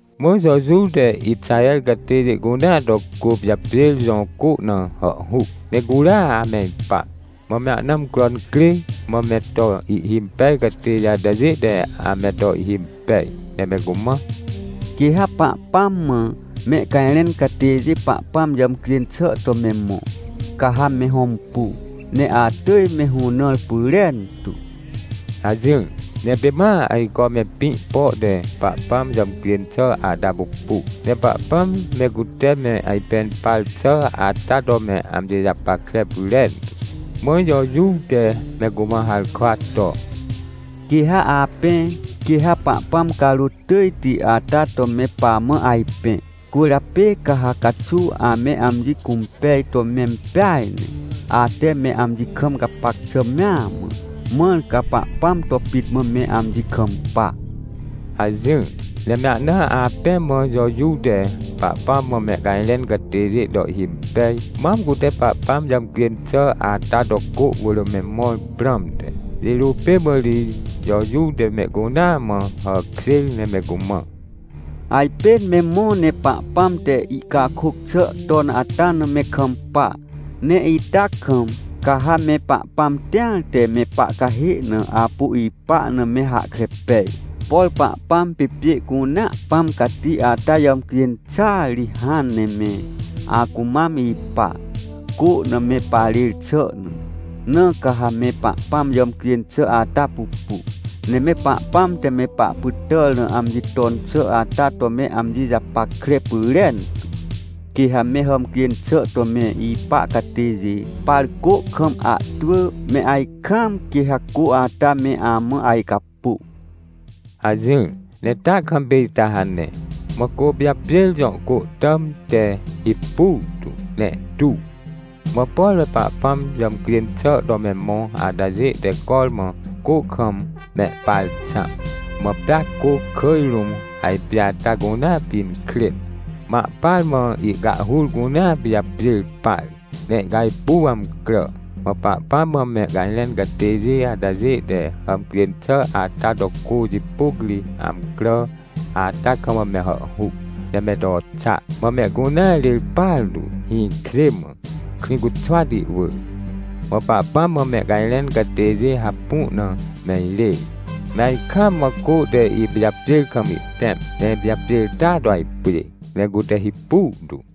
Mã Jojuw te Ixaher catêjê cunea to Côpijapjêr jõ côna hàhhuc, ne curia ame ipa. Mã me ahna amcro incrê, mã me toihhimpej catêjê atajê te ame to ihhimpej, ne me cumã: — Quê ha Pahpãm mã mehcajrẽn catêjê Pahpãm jàmcjên xà to me mõ, caha me hõmpu, ne atỳj me hũnãr pyrentu — hajỹr. Ne pê ma ajco me pĩ pote Pahpãm jàmcjên xà ata pupu, ne Pahpãm me cute me ajpẽn par xà ata to me amji japackre pyrentu. Mã Jojuw te me cumã harkwa to: — Quê ha apẽ, quê ha Pahpãm carôt tỳjti ata to me pamã ajpẽ. Cwỳrjapê ca ha caxuw ame amji cũmpej to mempeaj ne, ate me amji kam gapac xà mea mã, mãr ca Pahpãm to pit mã me amji kampa — hajỹr. Ne me ahna apẽ mã Jojuw te Pahpãm mã mehcajrẽn catêjê to ihhimpej, mam cutePahpãm jàmcjên xà ata to cô wỳr memõr prãmte. Jirô pê mã ri Jojuw te mehcunea mã hàkjêr ne me cumã: — Ajpên me mõ ne Pahpãm te ihcakôc xà ton ata na me kampa. Ne ita kamca ha me Pahpãm tĩar te me pahcahê na apu ipa na me hahkre pej. PorPahpãm pê pjê cunea Pãm Cati ata jàmcjên xàa ri hãn ne me acumam ipa, cô na me parêrxà na. Na ca ha me Pahpãm jàmcjên xà ata pupu, ne me Pahpãm te mepahpytàr na amji ton xà ata to me amji japackre pyrentu. Quê hame hàmcjên xà to me ipa catêjê par cô kam ahtwỳ, me ajkaamquê ha cô ata me amã ajcapô — hajỹr. Ne ta kam pê ita hane. Mã Côpijapjêr jõ cô tàm te hipu tu, ne ihtu. Mã por me Pahpãm jàmcjên xà to me mõ atajê te cormã cô kam mehparxãm, mã pea cô kỳj rũm ajpjê ata cunea pinkrên, mã ahpar mãihcahhur cunea pijapjêr par, ne ihcajpuw amcrà. Mã Pahpãm mã mehcajrẽncatêjê atajê te hàmcjên xà ata to cô jipôc ri amcrà ata kam mehàhhuc, ne me to xa. Mã mehcunea rêr partu, hĩkjê mã, Krĩcuxwati wỳr. Mã Pahpãm mã mehcajrẽn catêjê hapu na me irêr, me ajkaam mã cô teipijapjêr kam ihtẽm, ne ipijapjêr ta to ajpjê, ne cute hipu tu.